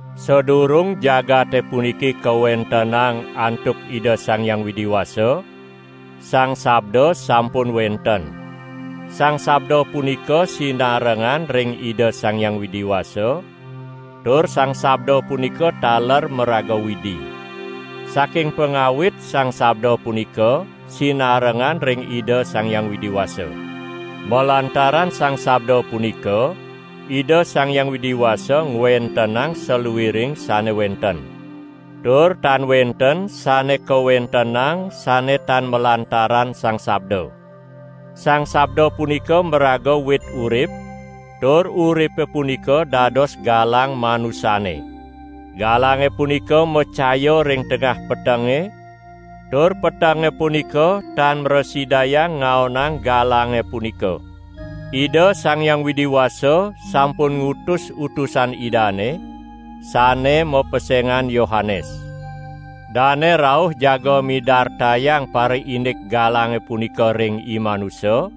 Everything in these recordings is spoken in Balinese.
Sadurung jagate puniki kawentenang antuk Ida Sang Hyang Widi Wasa, Sang Sabda sampun wenten. Sang Sabda punika sinarengan ring Ida Sang Hyang Widi Wasa, tur Sang Sabda punika taler maraga Widi. Saking pangawit Sang Sabda punika sinarengan ring Ida Sang Hyang Widi Wasa. Malantaran Sang Sabda punika Ida Sang Hyang Widi Wasa ngwentenang saluiring sane wenten. Tur tan wenten sane kawentenang sane tan malantaran Sang Sabda. Sang Sabda punika maraga wit urip, tur uripe punika dados galang manusane. Galange punika macaya ring tengah petenge, tur petenge punika tan mrasidayang ngaonang galange punika. Ida Sang Hyang Widi Wasa sampun ngutus utusan Idane, sane mapesengan Yohanes. Dane rauh jaga midartayang pariindik galange punika ring imanusa,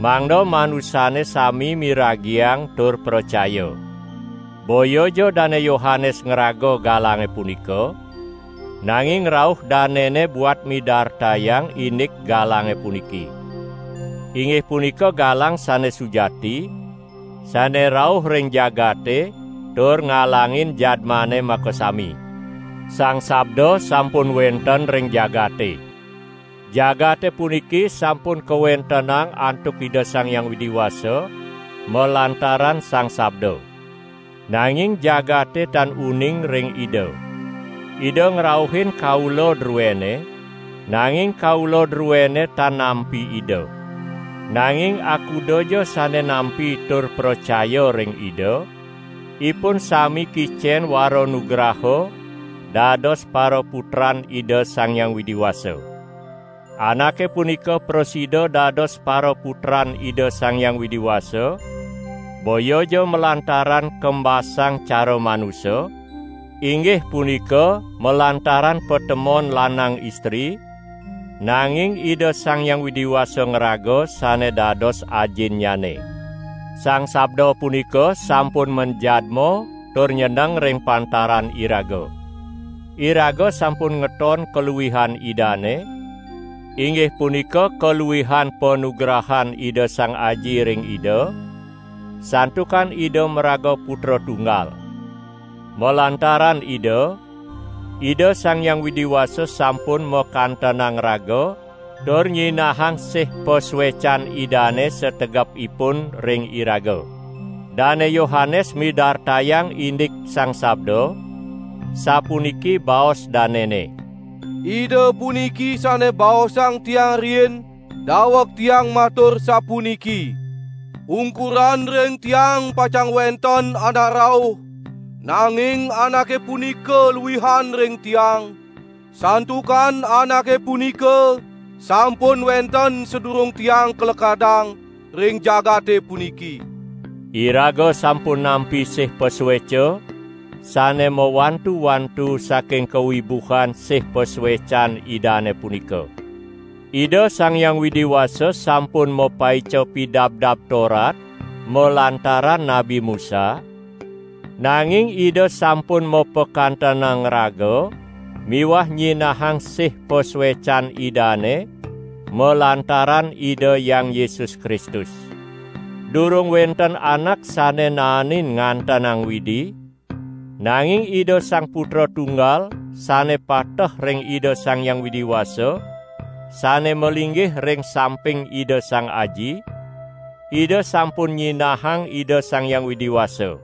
mangda manusane sami miragiang tur pracaya. Boyaja Dane Yohanes ngraga galange punika, nanging rauh danene buat midartayang indik galange puniki. Inggih punika galang sane sujati, sane rauh ring jagate tur ngalangin jadmane makasami. Sang Sabda sampun wenten ring jagate. Jagate punika sampun kawentenang antuk Ida Sang Hyang Widi Wasa malantaran Sang Sabda. Nanging jagate tan uning ring Ida. Ida ngrauhin kaula druene, nanging kaula druene tan nampi Ida. Nanging akudaja sane nampi tur pracaya ring Ida, ipun sami kicen waranugraha dados paraputran Ida Sang Hyang Widi Wasa. Anake punika prasida dados paraputran Ida Sang Hyang Widi Wasa, boyaja malantaran kembasang cara manusa, inggih punika malantaran patemon lanang istri, nanging Ida Sang Hyang Widi Wasa ngraga sane dados Ajinnyane. Sang Sabda punika sampun manjadma tur nyeneng ring pantaran iraga. Iraga sampun ngeton kaluihan Idane, inggih punika kaluihan panugrahan Ida Sang Aji ring Ida, santukan Ida maraga Putra Tunggal. Malantaran Ida, Ida Sang Hyang Widi Wasa sampun makantenang raga tur nyinahang sih pasuecan Idane sategepipun ring iraga. Dane Yohanes midartayang indik Sang Sabda, sapuniki baos danene: "Ida puniki sane baosang tiang riin, daweg tiang matur sapuniki: 'Ungkuran ring tiang pacang wenten Anak rauh, nanging Anake punika luihan ring tiang, santukan Anake punika sampun wenten sadurung tiang kalekadang ring jagate puniki.' " Iraga sampun nampi sih pasueca sane mawantu-wantu saking kawibuhan sih pasuecan Idane punika. Ida Sang Hyang Widi Wasa sampun mapaica Pidabdab Torat malantaran Nabi Musa, nanging Ida sampun mapakantenang raga miwah nyinahang sih pasuecan Idane malantaran Ida Hyang Yesus Kristus. Durung wenten anak sane naenin ngantenang Widi, nanging Ida Sang Putra Tunggal sane pateh ring Ida Sang Hyang Widi Wasa sane malinggih ring samping Ida Sang Aji, Ida sampun nyinahang Ida Sang Hyang Widi Wasa.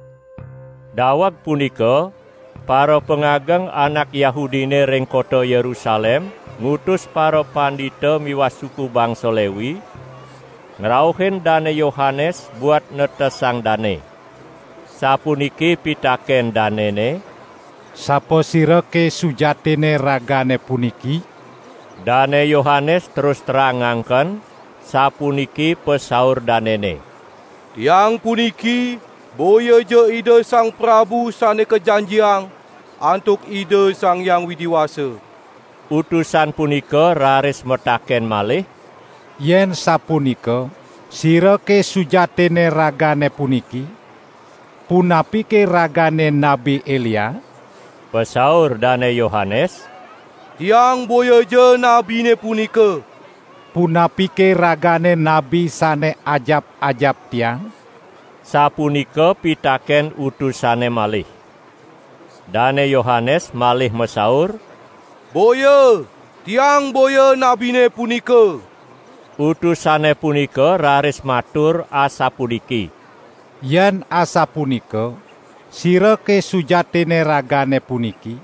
Daweg punika parapangageng anak Yahudine ring kota Yerusalem ngutus parapandita miwah suku bangsa Lewi ngrauhin Dane Yohanes buat netesang dane. Sapuniki pitaken danene: "Sapasirake sujatinne ragane puniki?" Dane Yohanes terus terang ngangken, sapuniki pasaur danene: "Tiang puniki boyaja Ida Sang Prabu Sane Kajanjiang antuk Ida Sang Hyang Widi Wasa." Utusan punika raris mataken malih: "Yen sapunika, sirake sujatinne ragane puniki? Punapike ragane Nabi Elia?" Pasaur Dane Yohanes: "Tiang boyaja nabine punika." "Punapike ragane nabi sane ajap-ajap tiang?", sapunika pitaken utusane malih. Dane Yohanes malih masaur: "Boya, tiang boya nabine punika!" Utusane punika raris matur asapuniki: "Yen asapunika, sirake sujatinne ragane puniki?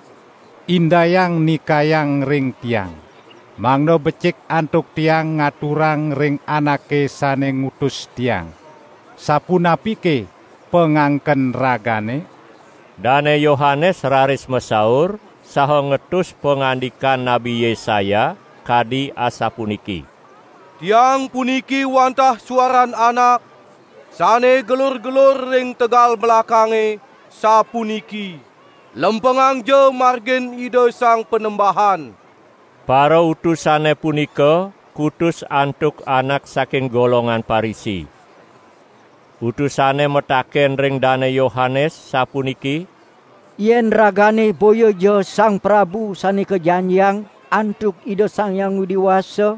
Indayang nikayang ring tiang, mangda becik antuk tiang ngaturang ring anake sane ngutus tiang! Sapunapike pangangken ragane?" Dane Yohanes raris masaur saha ngetus pangandikan Nabi Yesaya kadi asapuniki: "Tiang puniki wantah suaran anak, sane gelur-gelur ring tegal melakange, sapuniki: 'Lempengangja margin Ida Sang Panembahan.' " Parautusane punika kutus antuk anak saking golongan Parisi. Utusane mataken ring Dane Yohanes sapuniki: "Yen ragane boyaja Sang Prabu Sane Kajanjiang antuk Ida Sang Hyang Widi Wasa,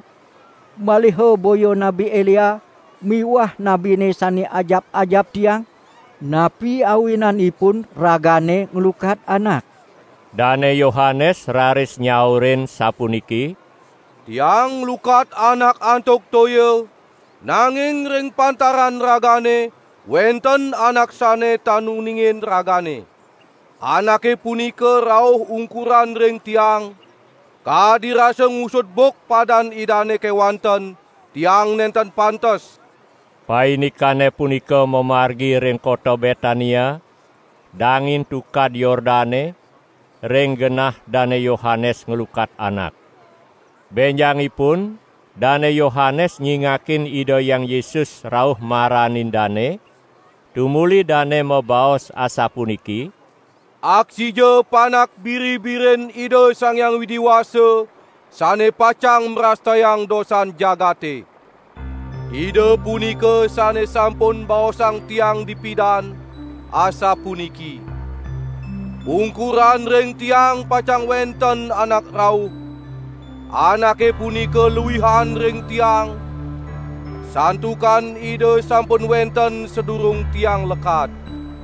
maliha boya Nabi Elia miwah nabine sane ajap-ajap tiang, napi awinanipun ragane nglukat anak?" Dane Yohanes raris nyaurin sapuniki: "Tiang nglukat anak antuk toya, nanging ring pantaran ragane wenten Anak sane tan uningin ragane. Anake punika rauh ungkuran ring tiang, kadi rasa ngusud buk padan Idane kewanten tiang nenten pantes." Paindikane punika mamargi ring kota Betania, dangin Tukad Yordane, ring genah Dane Yohanes nglukat anak. Benjangipun Dane Yohanes nyingakin Ida Hyang Yesus rauh maranin dane, tumuli dane mabaos asapuniki: "Aksija Panak Biri-birin Ida Sang Hyang Widi Wasa sane pacang mrastayang dosan jagate. Ida punika sane sampun baosang tiang dipidan, asapuniki: Ungkuran ring tiang pacang wenten Anak rauh. Anake punika luihan ring tiang, santukan Ida sampun wenten sadurung tiang lekad.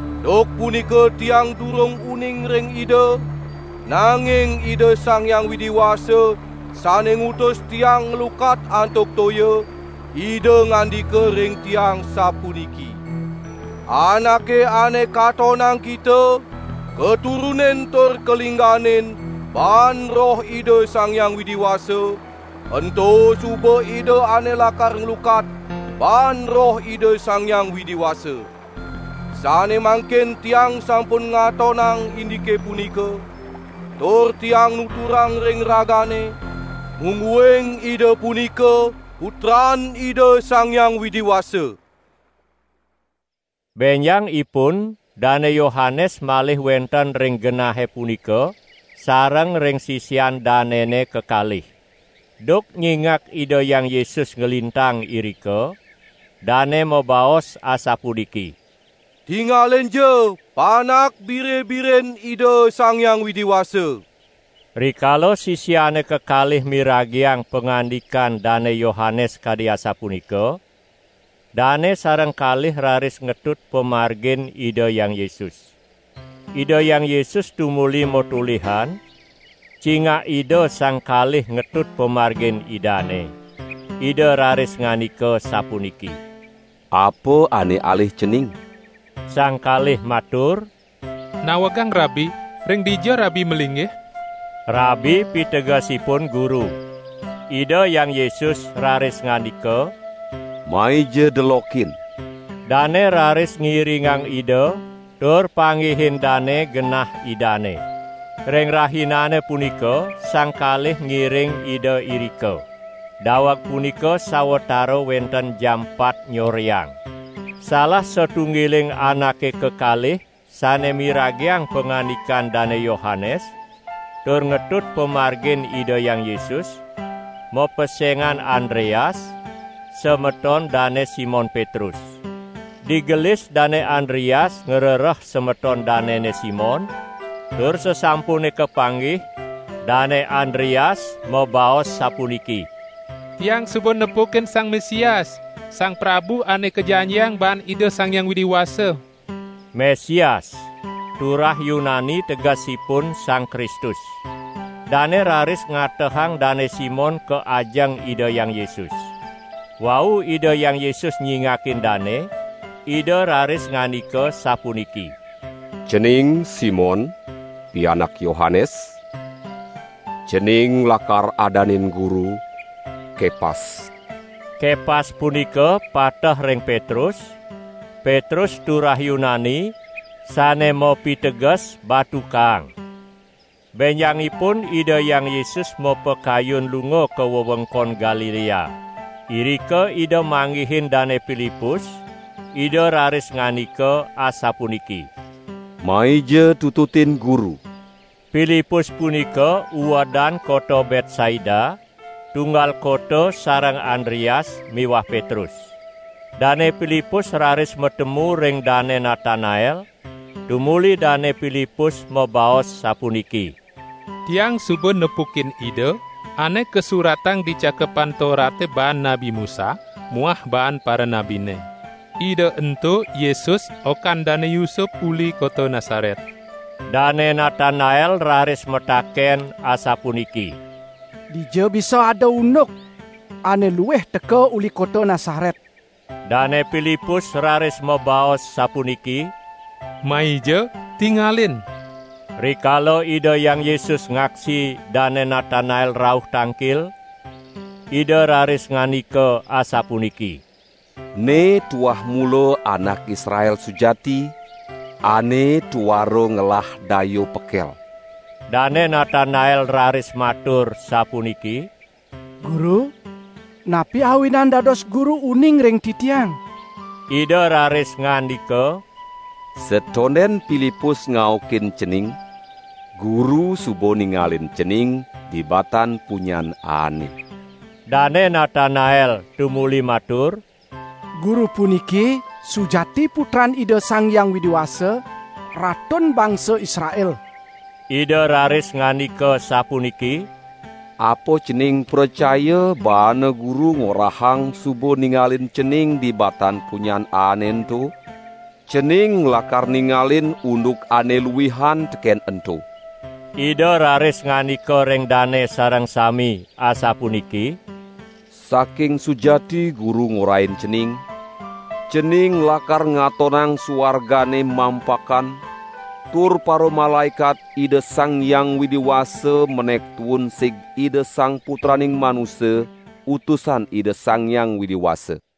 Duk punika tiang durung uning ring Ida, nanging Ida Sang Hyang Widi Wasa sane ngutus tiang nglukat antuk toya, Ida ngandika ring tiang sapuniki: 'Anake ane katonang kita katurunin tur kalingganin baan Roh Ida Sang Hyang Widi Wasa, ento suba Ida ane lakar nglukat baan Roh Ida Sang Hyang Widi Wasa.' Sane mangkin tiang sampun ngatonang indike punika, tur tiang nuturang ring ragane, mungguing Ida punika Putran Ida Sang Hyang Widi Wasa." Benjangipun Dane Yohanes malih wenten ring genahe punika sareng ring sisian danene kekalih. Duk nyingak Ida Hyang Yesus nglintang irika, dane mabaos asapuniki: "Tingalinja Panak Biri-birin Ida Sang Hyang Widi Wasa!" Rikala sisiane kekalih miragiang pangandikan Dane Yohanes kadi asapunika, dane sareng kalih raris ngetut pamargin Ida Hyang Yesus. Ida Hyang Yesus tumuli matolihan, cingak Ida sang kalih ngetut pamargin Idane. Ida raris ngandika sapuniki: "Apa ane alih cening?" Sang kalih matur: "Nawegang Rabi, ring dija Rabi malinggih?" (Rabi pitegesipun Guru.) Ida Hyang Yesus raris ngandika: "Maija delokin!" Dane raris ngiringang Ida tur panggihin dane genah Idane. Ring rahinane punika sang kalih ngiring Ida irika. (Daweg punika sawatara wenten jam pat nyoreang.) Salah satunggiling anake kekalih sane miragiang pangandikan Dane Yohanes tur ngetut pamargin Ida Hyang Yesus, mapesengan Andreas, semeton Dane Simon Petrus. Digelis Dane Andreas ngrereh semeton danene Simon, tur sasampune kapanggih, Dane Andreas mabaos sapuniki: "Tiang suba nepukin Sang Mesias, Sang Prabu Ane Kajanjiang baan Ida Sang Hyang Widi Wasa!" (Mesias, turah Yunani tegesipun Sang Kristus.) Dane raris ngatehang Dane Simon ka ajeng Ida Hyang Yesus. Wau Ida Hyang Yesus nyingakin dane, Ida raris ngandika sapuniki: "Cening Simon pianak Yohanes; cening lakar adanin Guru: Kepas." (Kepas punika pateh ring Petrus; Petrus turah Yunani, sane mapiteges Batu Kaang.) Benjangipun Ida Hyang Yesus mapakayun lunga ka wewengkon Galilea. Irika Ida manggihin Dane Pilipus; Ida raris ngandika asapuniki: "Maija tututin Guru!" ( Pilipus punika uedan kota Betsaida, tunggal kota sareng Andreas miwah Petrus.) Dane Pilipus raris matemu ring Dane Natanael tumuli Dane Pilipus mabaos sapuniki: "Tiang suba nepukin Ida ane kasuratang di Cakepan Torate baan Nabi Musa muah baan paranabine. Ida ento Yesus okan Dane Yusup uli kota Nasaret." Dane Natanael raris mataken asapuniki: "Dija bisa ada unduk ane luih teka uli kota Nasaret!" Dane Pilipus raris mabaos sapuniki: "Maija, tingalin!" Rikala Ida Hyang Yesus ngaksi Dane Natanael rauh tangkil, Ida raris ngandika asapuniki: "Ne tuah mula anak Israel sujati, ane tuara ngelah daya pekel!" Dane Natanael raris matur sapuniki: "Guru, napi awinan dados Guru uning ring titiang?" Ida raris ngandika: "Satonden Pilipus ngaukin cening, Guru suba ningalin cening di batan punyan aane!" Dane Natanael tumuli matur: "Guru puniki sujati Putran Ida Sang Hyang Widi Wasa, Ratun bangsa Israel!" Ida raris ngandika sapuniki: "Apa cening pracaya baane Guru ngorahang suba ningalin cening di batan punyan aane ento? Cening lakar ningalin unduk ane luihan teken ento!" Ida raris ngandika ring dane sareng sami asapuniki: "Saking sujati Guru ngorahin cening, cening lakar ngatonang suargane mampakan tur paramalaekat Ida Sang Hyang Widi Wasa menek tuun sig Ida Sang Putraning Manusa, Utusan Ida Sang Hyang Widi Wasa!"